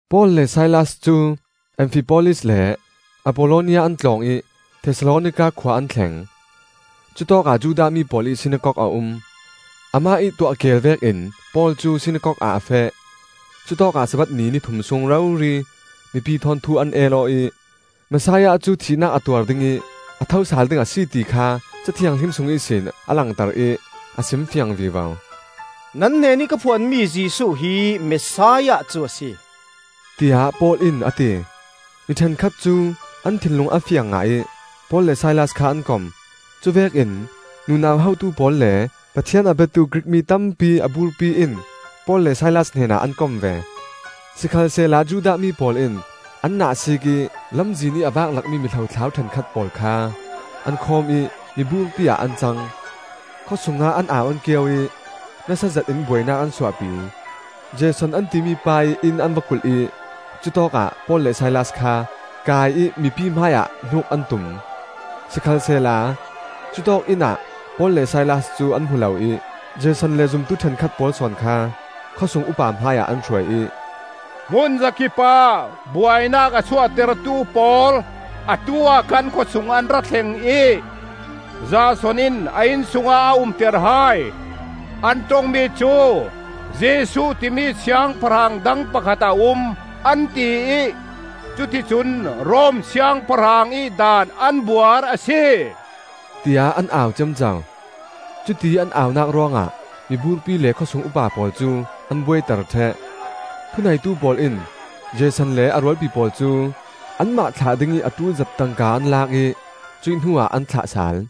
Paul le Silas cu Amfipolis le Appollonia an tlawng ih Thesalonika khua an thleng. Cutawkah Judah mi pawl ih sinakok a um. Amah ih tuah keel vekin Paul cu Sinakok ah a feh. Cutawkah Sabbath ni ni thum sung rori mipi thawn thu an el aw ih, Messiah cu thihnak a tuar ding ih a thosal ding a si ti kha Ca Thianghlim sung ihsin a langter ih a simfiang vivo. “Nan hnenih ka phuanmi Jesuh hi Messiah cu a si,” tiah Paul in a ti. Mi ṭhenkhat cu an thinlung a fiang ngah ih Paul le Silas kha an kom. Cuvekin nunau hotu pawl le Pathian a biatu Grik mi tampi a burpi in Paul le Silas hnenah an kom ve. Sikhalsehla Judah mi pawl in an nahsiik ih lamzin ih a vak lakmi mi hlothlau ṭhenkhat pawl kha an khawm ih miburpi ah an cang. Khawsungah an au an kio ih nasa zetin buainak an suahpi. Jason an timi pa ih inn an va kulh ih cutawkah Paul le Silas kha kai ih mipi hmai ah hnuk an tum. Sikhalsehla cutawk inn ah Paul le Silas cu an hmu lo ih Jason le zumtu ṭhenkhat pawl sawn kha khawsung upa hmaiah an hruai ih, “Hmunzakipah buainak a suahtertu pawl, atu-ah kan khawsung an ra thleng ih, Jason in a inn sungah a umter hai. An ṭongmi cu ‘Jesuh timi siangpahrang dang pakhat a um,’ an tiih cuti cun Rom siangpahrang ih daan an buar a si,” tiah an au ciamco. Cutiih an aunak ruangah miburpi le khawsung upa pawl cu an buaiter ṭheh. Thuneitu pawl in Jason le a rualpi pawl cu anmah thlah dingih a ṭul zat tangka an lak ih cuih hnuah an thlah sal.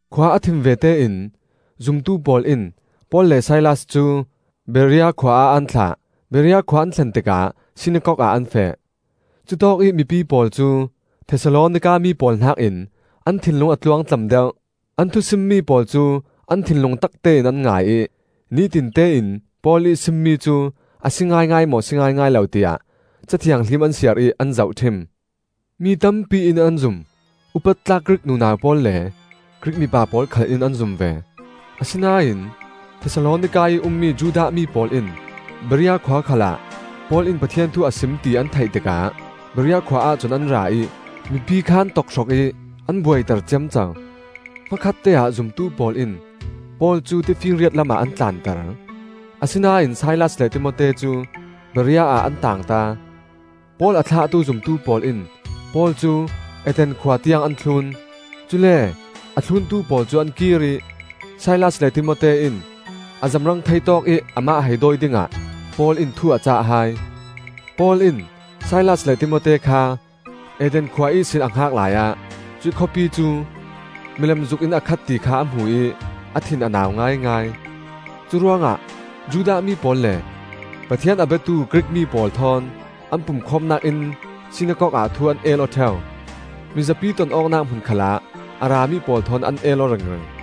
Khua a thim vete in zumtu pawl in Paul le Silas cu Berea khua ah an thlah. Berea khua an thlen tikah sinakok ah an feh. Cutawkih mipi pawl cu Thesalonika mi pawl hnakin an thinlung a tluangtlam deuh. An thusimmi pawl cu an thinlung taktein an ngai ih, nitinte in Paul ih simmi cu a si ngaingai maw, si ngaingai lo tiah Ca Thianghlim an siar ih an zohṭhim. Mi tampi in an zum; upat tlak Grik nunau pawl le Grik mipa pawl khal in an zum ve. Asinain Thesalonika ih ummi Judah mi pawl in Berea khua khalah Paul in Pathian thu a sim ti an theih tikah Berea khua ahcun an ra ih mipi kha an tokhrok ih an buaiter ciamco. Hmakhatte-ah zumtu pawl in Paul cu tifinriat lamah an tlanter; asinain Silas le Timote cu Berea ah an taangta. Paul a thlahtu zumtu pawl in Paul cu Athens khua tiang an thlun; cule a thluntu pawl cu an kir ih Silas le Timote in a zamrang thei tawkih amah hei dawi dingah Paul in thu a cah hai. Paul in Silas le Timote kha Athens khua ihsin a hngak laiah cuih khawpi cu milem zuk in a khat ti kha a hmu ih a thin a nau ngaingai. Curuangah Judah mi pawl le Pathian a biatu Grik mi pawl thawn an pumkhawmnak inn sinakok ah thu an el aw ṭheu; mizapi ton awknak hmun khalah a rami pawl thawn an el aw ringring.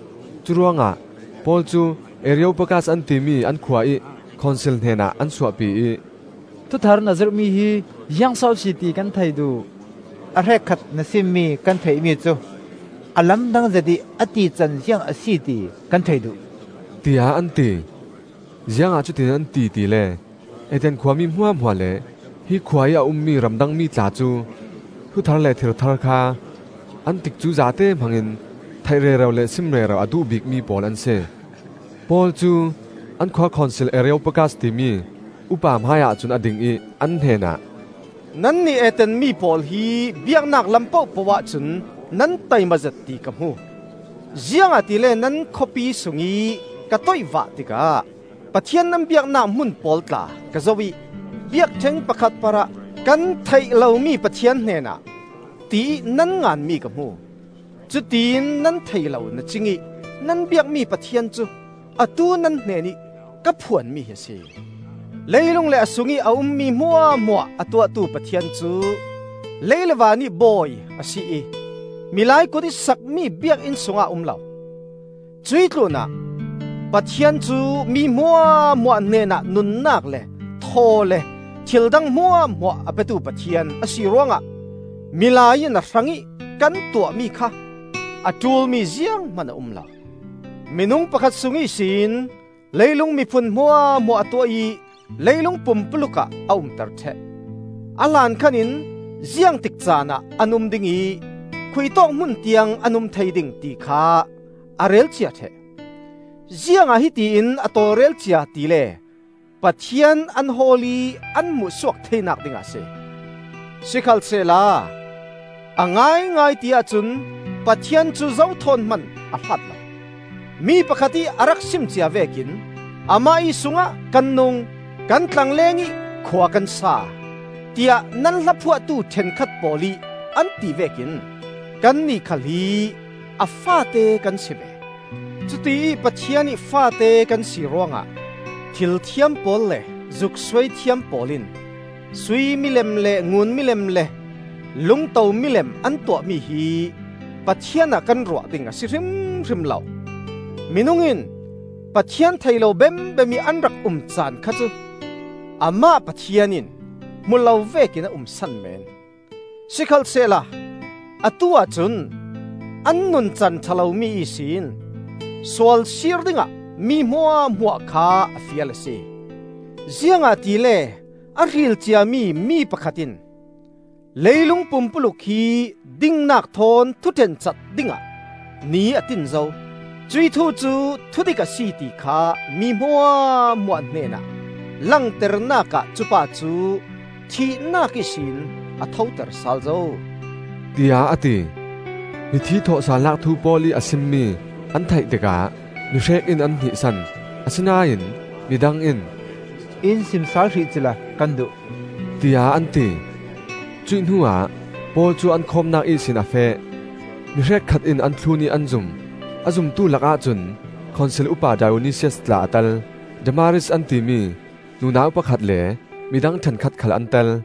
Curuangah Paul cu Areopagas an timi an khua ih khonsil hnenah an suahpi ih, “Thuthar na zirhmi hi ziangso a si, ti kan thei duh. A hrekkhat na simmi kan theihmi cu a lamdang zet ih a tican ziang a si ti kan thei duh,” tiah an ti. (Ziangah cutin an ti tile Athens khua mi hmuahhmuah le hi khua ih a ummi ramdang mi tla cu thu thar le thil thar kha an tikcu zate hmangin theih rero le sim rero a duh bikmi pawl an si.) Paul cu an khua khonsil Areopagas timi upa hmaiah cun a ding ih an hnenah, “Nannih Athens mi pawl hi biaknak lam pohpoh ahcun nan taimazet ti ka hmu. Ziangahtile nan khawpi sungih ka toihvah tikah Pathian nan biaknak hmun pawl tla ka zoh ih biakṭheng pakhat parah ‘Kan Theih Lomi Pathian Hnenah,’ tiih nan nganmi ka hmu. Cutiin nan thei lo na-cingih nan biakmi Pathian cu atu nan hnenih ka phuanmi hi a si. Leilung le a sungih a ummi hmuahhmuah a tuahtu Pathian cu lei le vanih Bawi a si ih milai kutih sakmi biakinn sungah a um lo. Cuih tlunah Pathian cu mi hmuahhmuah hnenah nunnak le thaw le thildang hmuahhmuah a petu Pathian a si ruangah milai in a hrangih kan tuahmi kha a ṭulmi zianghman a um lo. Minung pakhat sung ihsin leilung miphun hmuahhmuah a tuah ih leilung pumpuluk ah a umter ṭheh. A hlankhan in ziangtik caanah an um ding ih khuitawk hmun tiang an um thei ding, ti kha a relcia ṭheh. Ziangah hiti in a tawlrel cia tile Pathian an hawl ih an hmuh suak theinak dingah a si. Sikhalsehla a ngaingai ti-ah cun Pathian cu zo thawn hman a hlat lo. Mi pakhat ih a rak sim cia vekin, ‘Amah ih sungah kan nung, kan tlangleng ih khua kan sa!’ tiah nan hla phuahtu ṭhenkhat pawl ih an tivek in, ‘Kannih khal hi a faate kan si ve.’ Cutiih Pathian ih faate kan si ruangah thilthiam pawl le zuk suaithiam pawl in sui milem le ngun milem le lungto milem an tuahmi hi Pathian ah kan ruah ding a si hrimhrim lo. Minung in Pathian thei lo bembem ih an rak um caan kha cu Amah Pathian in hmu lo vekin a um san meen; sikhalsehla atu-ah cun an nuncan ṭha lomi ihsin sualsir dingah mi hmuahhmuah kha a fial a si. Ziangahtile a hril ciami mi pakhat in leilung pumpuluk hi dingnak thawn thuṭhen cat dingah ni a tin zo. Cuih thu cu thudik a si, ti kha mi hmuahhmuah hnenah langternak ah cupa cu thihnak ihsin a thoter sal zo,” tiah a ti. Mithi thawhsalnak thu Paul ih a simmi an theih tikah mi hrek in an hnihsan; asinain midang in, “In sim sal hrih cila kan duh,” tiah an ti. Cuih hnuah Paul cu an khawmnak ihsin a feh. Mi hrekkhat in an thlun ih an zum. A zumtu lakah cun Khonsil upa Dionisias tla a tel. Damaris an timi nunau pakhat le midang ṭhenkhat khal an tel.